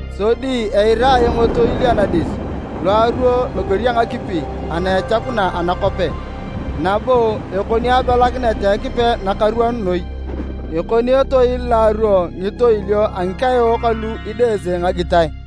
Sodi eira ayong etoil anadis lo aruo loger a ngakipi ana echakuna anakope nabo ekoni abelakinet a Ekipe nakaruon noi. Ekoni etoil lo aruo ngitoilio a ngikaeok alu idese ngagitae.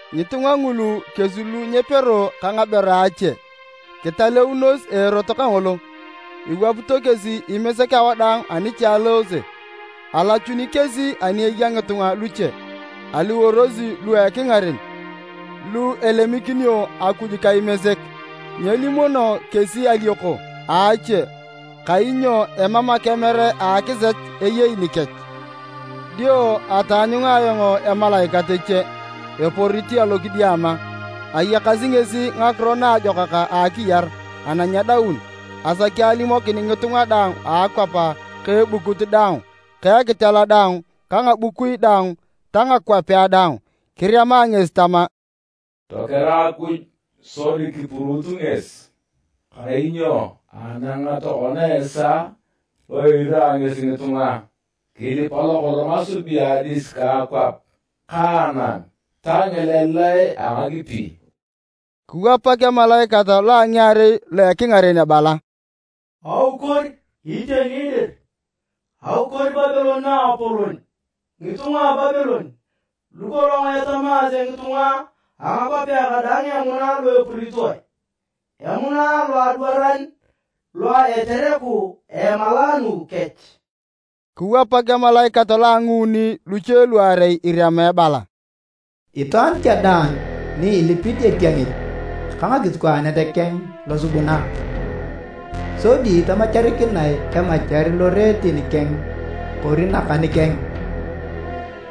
Ngitunga ngulu kesi lu nyepero ka ngaber a ache, kitaleunos a erot kangolo. Iwapito kesi Imesek awadaang ani cha elosi. Alachun kesi ani eya ngitunga luche, aliworosi lu a ekingaren lu elemikinio Akuj ka Imesek. Nyelimuno kesi alioko a ache, kainyo emam akemer a akisech eyei nikech. Dio ataanyunga ayong emalaikat eche eporit alokidiama. Ayakasi ngesi Ngakiro Naajokak a akiyar ana nyedaun asaki alimokin ngitunga daang a akwap ka ebukut daang ka ekitela daang ka ngabukui daang ta ngakwapea daang. Kirema ngesi tama, “Tokera Akuj sodi kipuruut ngesi! Kainyo anang tokona esaa lo irira ngesi ngitunga. Kilipa lokolong asubuni adis ka akwap ka anam ta ngileleae a ngakipi!” Kiwapak emalaikat lo a ngiarei lo a ekingaren ebala, “Aukor! Iteni dir, aukor Babilon naapolon! Ngitunga a Babilon lukolong etamaase ngitunga a ngakwapea kadaang emuna lo epuritoe, emuna lo adwaran lo a etereku a emalaanu kech!” Kiwapak emalaikat lo a nguuni luche luarei, irema ebala, “Itwaan cha daang ni ilipit etiengit ka ekisikwaane keng losubuna, sodi tamacharikinae emachar loreet keng kori nakan keng,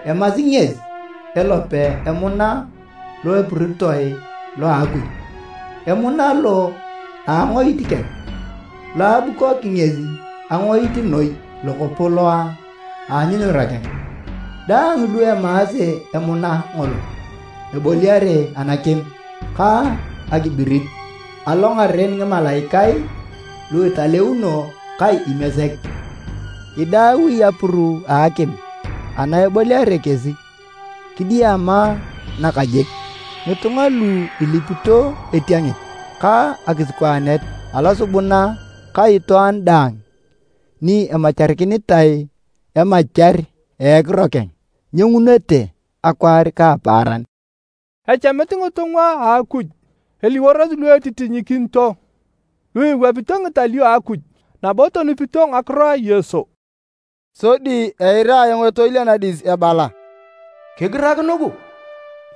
emasi ngesi elope emuna lo epuritoe lo a Akuj, emuna lo a angoit keng, lo abukoki ngesi engoit noi lokopo lo a anyunyura keng! Daang lu emaase emuna ngolo, eboliare anakim ka akibirit, alongaren ngimalaikae lu italeuno ka Imesek. Idaui apuru a akim ana eboliare kesi kidiama nakajik. Ngitunga lu ilipito etiengit ka ekisikwaane losubuna ka itwaan daang ni emacharikinitae emachar a ekiro keng, nyiengunete akwaar ka apaaran.” Echamit ngitunga a Akuj eliworosi lu etitinyikinito, lu iwapito ngitalio a Akuj nabo tonupito ngakiro a Yesu. Sodi eira ayong etoil anadis ebala, “Kigirak nugu!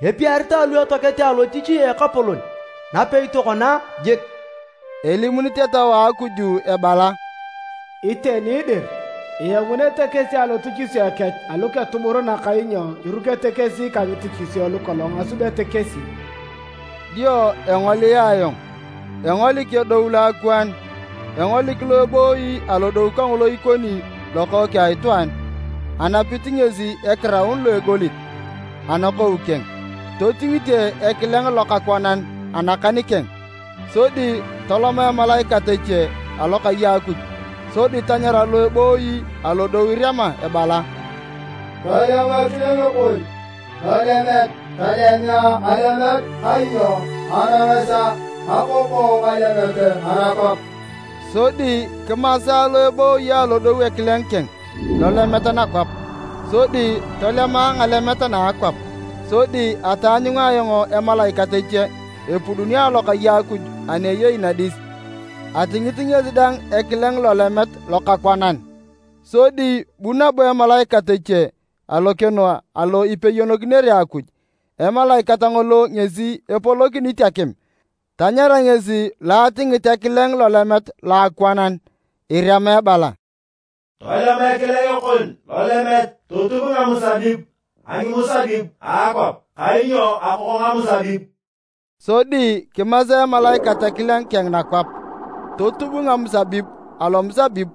Epiaritae lu etoakete alotich a Ekapolon napei tokona jik!” Elimunit Etau a Akuj ebala, “Iteni dir! Iengunete kesi alotichisio kech aluketuburunak kainyo irukete kesi ka ngitichisio lukolong asubete kesi.” Dio engolia ayong, engolik edou loakwaan. Engolik lo ebooyi alodou kangolo ikoni Lokookeng a Itwaan. Anapit ngesi ekiraun lo a egolit anakou keng, totingite ekileng lokakwanan anakan keng. Sodi tolom emalaikat eche alokai a Akuj sodi tanyara lo ebooyi alodou irema ebala, “Tolem ekileng kon lolemet tolemea ngalemet, kainyo anang esaa, akoko ngalemet anakwap!” Sodi kimasa lo ebooyi alodou ekileng keng lolemet nakwap, sodi tolemae ngalemet na a akwap. Sodi ataanyunga ayong emalaikat eche epuduni alokai a Akuj ana eyei nadis, atingit ngesi dang ekileng lolemet lokakwanan. Sodi bu nabo emalaikat eche alokeno alo ipeyonokinere Akuj, emalaikat ngolo ngesi epolokinit akim. Tanyara ngesi lo atingit ekileng lolemet loakwanan irema ebala, “Tolem ekileng kon lolemet totub ngamusabib a ngimusabib a akwap, kainyo akoko ngamusabib!” Sodi kimasa emalaikat ekileng keng nakwap, totub ngamusabib alomusabib,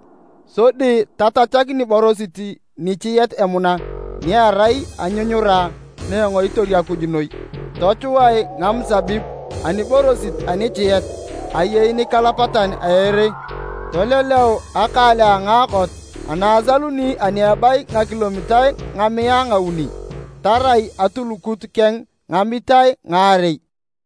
sodi tachakak niborosit nichiet emuna ni erai anyunyura na engoitor Akuj noi. Tochuae ngamusabib aniborosit anichiet ayei nikalapatan a ere, toleleu akaale a ngaakot na asaluni ani ebayi ngakilomitae ngamiae ngauni, tarai atulukuk keng ngamitae ngaarei.